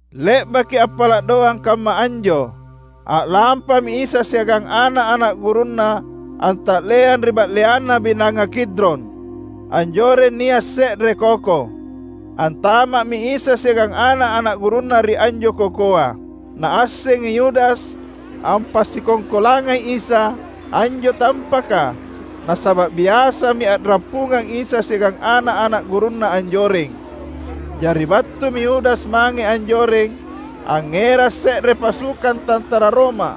Le’baki appala’ doang kamma anjo, a’lampami Isa siagang ana’-ana’ gurunNa anta’leang ri ba’leanna Binanga Kidron. Anjoreng nia’ se’re koko. Antama’mi Isa siagang ana’-ana’ gurunNa ri anjo kokoa. Naassengi Yudas (ampasikongkolangai Isa) anjo tampaka; nasaba’ biasami a’rappungang Isa siagang ana’-ana’ gurunNa anjoreng. Jari battumi Yudas mange anjoreng, angngerang se’re pasukang tantara Roma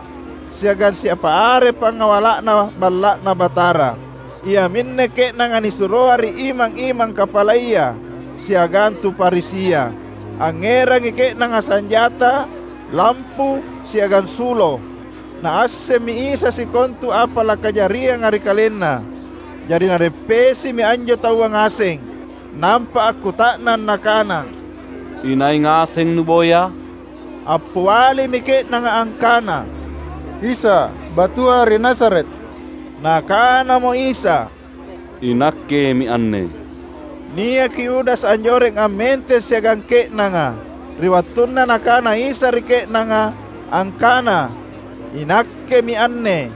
siagang siapa are pangawala’na Balla’Na Batara. Iaminne ke’nanga nisuroa ri imang-imang kapalaya siagang tu Farisia. Angngerangi ke’nanga sanjata, lampu, siagang sulo. Naassemmi Isa sikontu apa lakajarianga ri KalenNa. Jari Nareppesimi anjo taua ngaseng, nampa akkuta’nang Nakana, "Inai ngaseng nuboya?" Appialimi ke’nanga angkana, "Isa, battua ri Nazaret." Nakanamo Isa, "INakkemi anne." Niaki Yudas anjoreng ammenteng siagang ke’nanga. Ri wattunna Nakana Isa ri ke’nanga, angkana, "INakkemi anne,"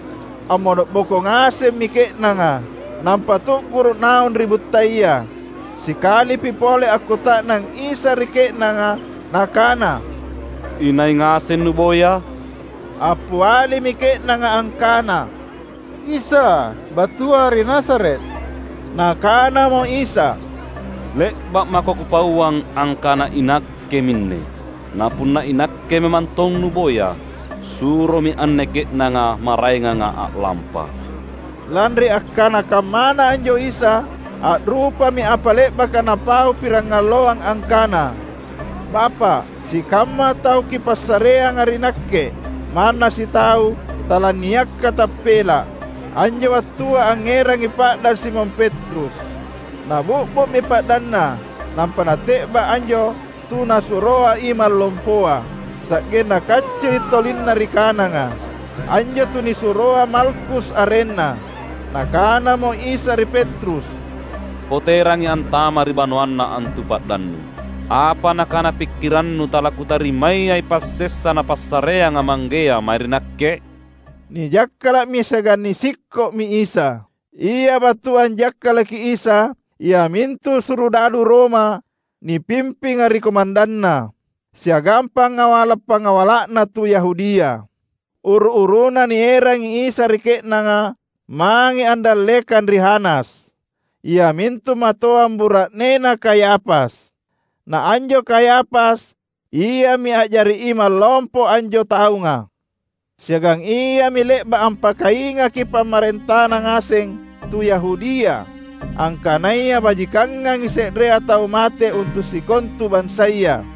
ammono’boko ngasemmi ke’nanga, nampa tu’guru’ naung ri buttaya. Sikalipi pole akkuta’nang Isa ri ke’nanga Nakana, "Inai ngaseng nuboya?" Appialimi ke’nanga angkana, "Isa, battua ri Nazaret." Nakanamo Isa, "Le’ba’ mako Kupauang angkana iNakke minne. Na punna iNakke memantong nuboya, suromi anne ke’nanga maraenganga a’lampa." (Lanri akkana kammana anjo Isa, a’rupami apa le’baka Napaupirangalloang angkana: "Bapa’, sikamma tau Kipassareanga ri Nakke, manna sitau talaniakka tappela’.") Anjo wattua angngerangi pa’dang Simon Petrus. Nabi’bu’mi pa’danna nampa nate’ba’ anjo tu nasuroa imang lompoa, sa’genna kaccili’ tolinna ri kananga. Anjo tunisuroa Malkus arenna. Nakanamo Isa ri Petrus, "Poterangi antama’ ri banoanna antu pa’dannu! Apa nakana pikkirannu talaKutarimayai passessa Napassareanga Manggea mae ri Nakke?" Nijakkala’mi siagang nisikko’mi Isa. Ia battua anjakkalaki Isa iamintu surudadu Roma nipimpinga ri komandanna, siagang pangawala’-pangawala’na tu Yahudia. Uru-uruna nierangi Isa ri ke’nanga mange andallekang ri Hanas, iamintu matoang bura’nena Kayafas. Na anjo Kayafas, iami a’jari imang lompo anjo taunga. Siagang iami le’ba’ ampakaingaki pamarentana ngaseng tu Yahudia angkanaya bajikangangi se’rea tau mate untu’ sikontu bansaya.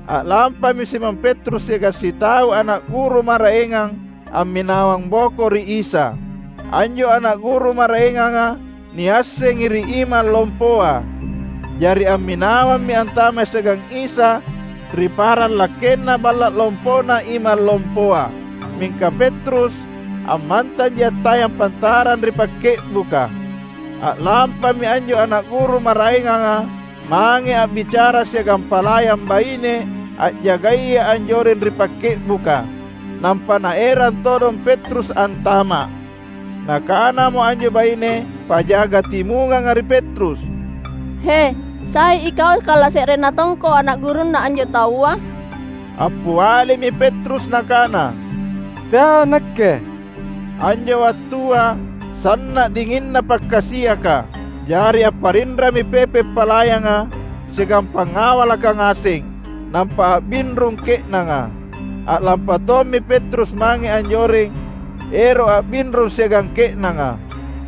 A’lampami Simon Petrus siagang sitau ana’ guru maraengang amminawang boko ri Isa. Anjo ana’ guru maraenganga niassengi ri imang lompoa; jari amminawammi antama’ siagang Isa ri paranglakkenna balla’ lompona imang lompoa. Mingka Petrus, ammantanji attayang pantarang ri pakke’buka. A’lampami anjo ana’ guru maraenganga mange a’bicara siagang palayang baine a’jagaya anjoreng ri pakke’buka, nampa naerang todong Petrus antama’. Nakanamo anjo baine pajaga timunganga ri Petrus, "He, sai ikau kalase’renna tongko ana’ gurunna anjo taua?" Appialimi Petrus nakana, "Teai Nakke." Anjo wattua sanna’ dinginna pakkasiaka. Jari apparinrami pepe’ palayanga siagang pangawalaka ngaseng, nampa a’binrung ke’nanga. A’lampa tommi Petrus mange anjoreng ero’ a’binrung siagang ke’nanga.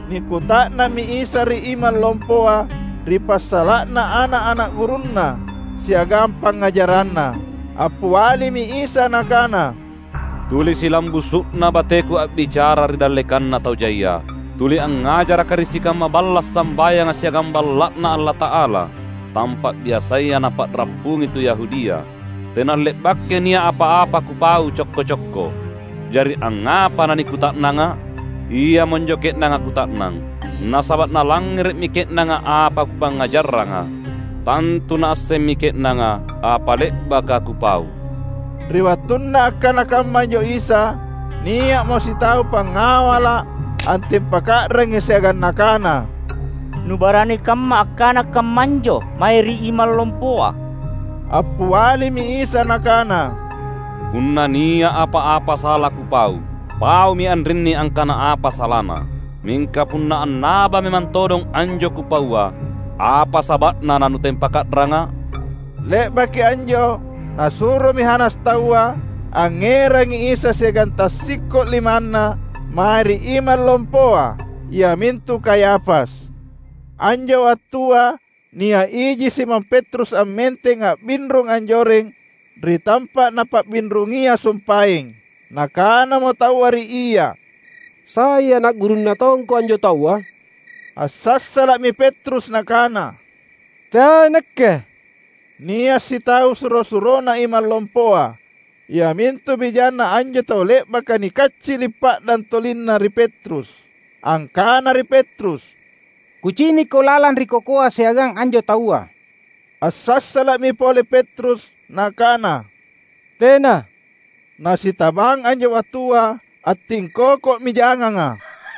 Nikuta’nammi Isa ri imang lompoa ri passala’na ana’-ana’ gurunNa siagang pangngajaranNa. Appialimi Isa Nakana, "Tuli silambusu’na bateKu a’bicara ri dallekanna tau jaia. Tuli angngajarakKa’ ri sikamma balla’ sambayanga siagang Balla’Na Allata’ala, tampa’ biasaya napa’rappungi tu Yahudia. Tena le’bakai nia’ apa-apa Kupau cokko-cokko. Jari angngapa nanikuta’nangA’? Iamonjo ke’nanga kuta’nang, nasaba’ nalangngere’mi ke’nanga apa Kupangngajarranga. Tantu naassemmi ke’nanga apa le’baka Kupau." Ri wattunna akkana kamma anjo Isa, nia’mo sitau pangawala’ antempaka’rangi siagang nakana, "Nubarani kamma akkana kammanjo mae ri imang lompoa!" Appialimi Isa Nakana, "Punna nia’ apa-apa sala Kupau, paumi anrinni angkana apa salana! Mingka punna annaba memang todong anjo Kupaua, apa saba’na nanutempaka’rangA’?" Le’baki anjo nasuromi Hanas taua angngerangi Isa siagang tassikko’ limanNa mae ri Imang Lompoa iamintu Kayafas. Anjo wattua nia’ iji Simon Petrus ammenteng a’binrung anjoreng ri tampa’ napa’binrungia sumpaeng. Nakanamo taua ri ia, "Sai ana’ gurunna tongko anjo Taua?" Assassala’mi Petrus nakana, "Teai nakke!" Nia’ sitau suro-surona imang lompoa, iamintu bijanna anjo tau le’baka nikaccili’ pa’dang tolinna ri Petrus, angkana ri Petrus, "Kucinikko lalang ri kokoa siagang anjo Taua!" Assassala’mi pole Petrus, nakana, "Tena," — na sitabang anjo wattua attingkokomi janganga –.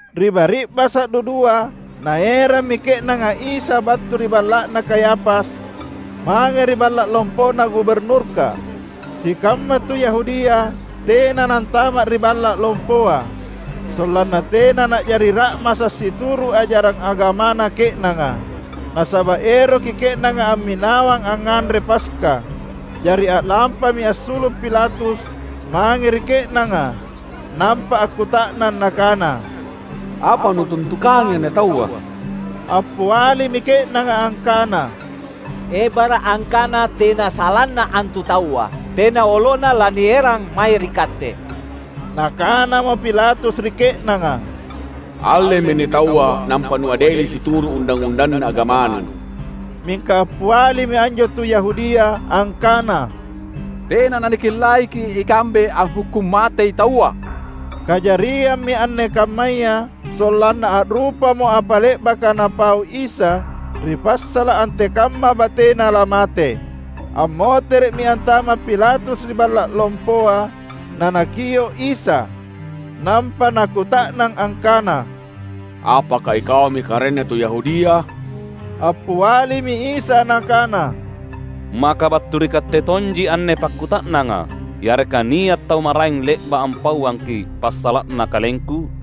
Ri bari’basa’ dudua naerammi ke’nanga Isa battu ri balla’na Kayafas mange ri balla’ lompona guburnurka. Sikamma tu Yahudia tena nantama’ ri balla’ lompoa, sollanna tena na’jari ra’masa’ situru’ ajarang agamana ke’nanga. Nasaba’ eroki ke’nanga amminawang angnganre Paska. Jari a’lampami assulu’ Pilatus mange ri ke’nanga nampa akkuta’nang nakana, "Apa nutuntukangi anne Taua?" Appialimi ke’nanga angkana, "Ebara’ angkana tena salanna antu Taua, tena olona lanierang mae ri katte." Nakanamo Pilatus ri ke’nanga, "Allemi anne Taua nampa nuadeli situru’ undang-undanna agamanu!" Mingka appialimi anjo tu Yahudia, angkana, "Tena nanikellaiki’ ikambe anghukkung matei taua." (Kajariammi anne kammaya, sollanna a’rupamo apa le’bakaNapau Isa, ri passala’ antekamma bateNa lamate.) Ammotere’mi antama’ Pilatus ri balla’ lompoa nanakio’ Isa, nampa nakuta’nang angkana, "Apaka iKaumi Karaeng tu Yahudia?" Appialimi Isa Nakana, "Maka battu ri katte tonji anne pakkuta’nanga, yareka nia’ tau maraeng le’ba’ ampauangki’ passala’na KalengKu?"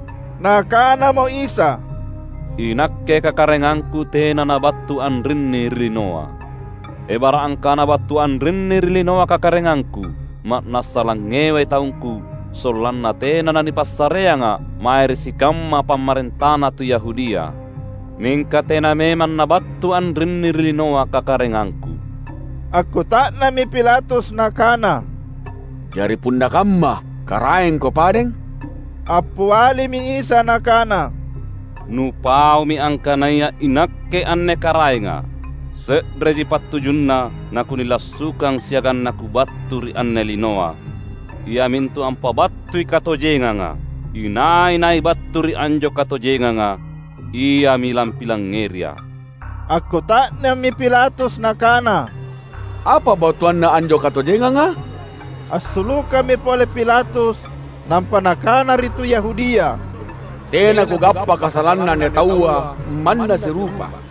Nakanamo Isa, "INakke kakaraengangKu tena nabattu anrinni ri linoa. Ebara’ angkana battu anrinni ri linoa kakaraengangKu, ma’nassa langngewai taungKu sollanna tena nanipassareangA’ mae ri sikamma pamarentana tu Yahudia. Mingka tena memang nabattu anrinni ri linoa kakaraengangKu!" Akkuta’nammi Pilatus nakana, "Jari punna kamma, KaraengKo padeng?" Appialimi Isa Nakana, "Nupaumi angkanaya iNakke anne karaengA’. Se’reji pattujunna naKunilassukang siagang naKubattu ri anne linoa, iamintu ampabattui katojenganga. Inai-nai battu ri anjo katojenganga iami lampilangngeriA’." Akkuta’nammi Pilatus nakana, "Apa battuanna anjo katojenganga?" Assulukammi pole Pilatus nampa nakana ri tu Yahudia, "Tena kugappa kasalanna anne Taua, manna sirupa.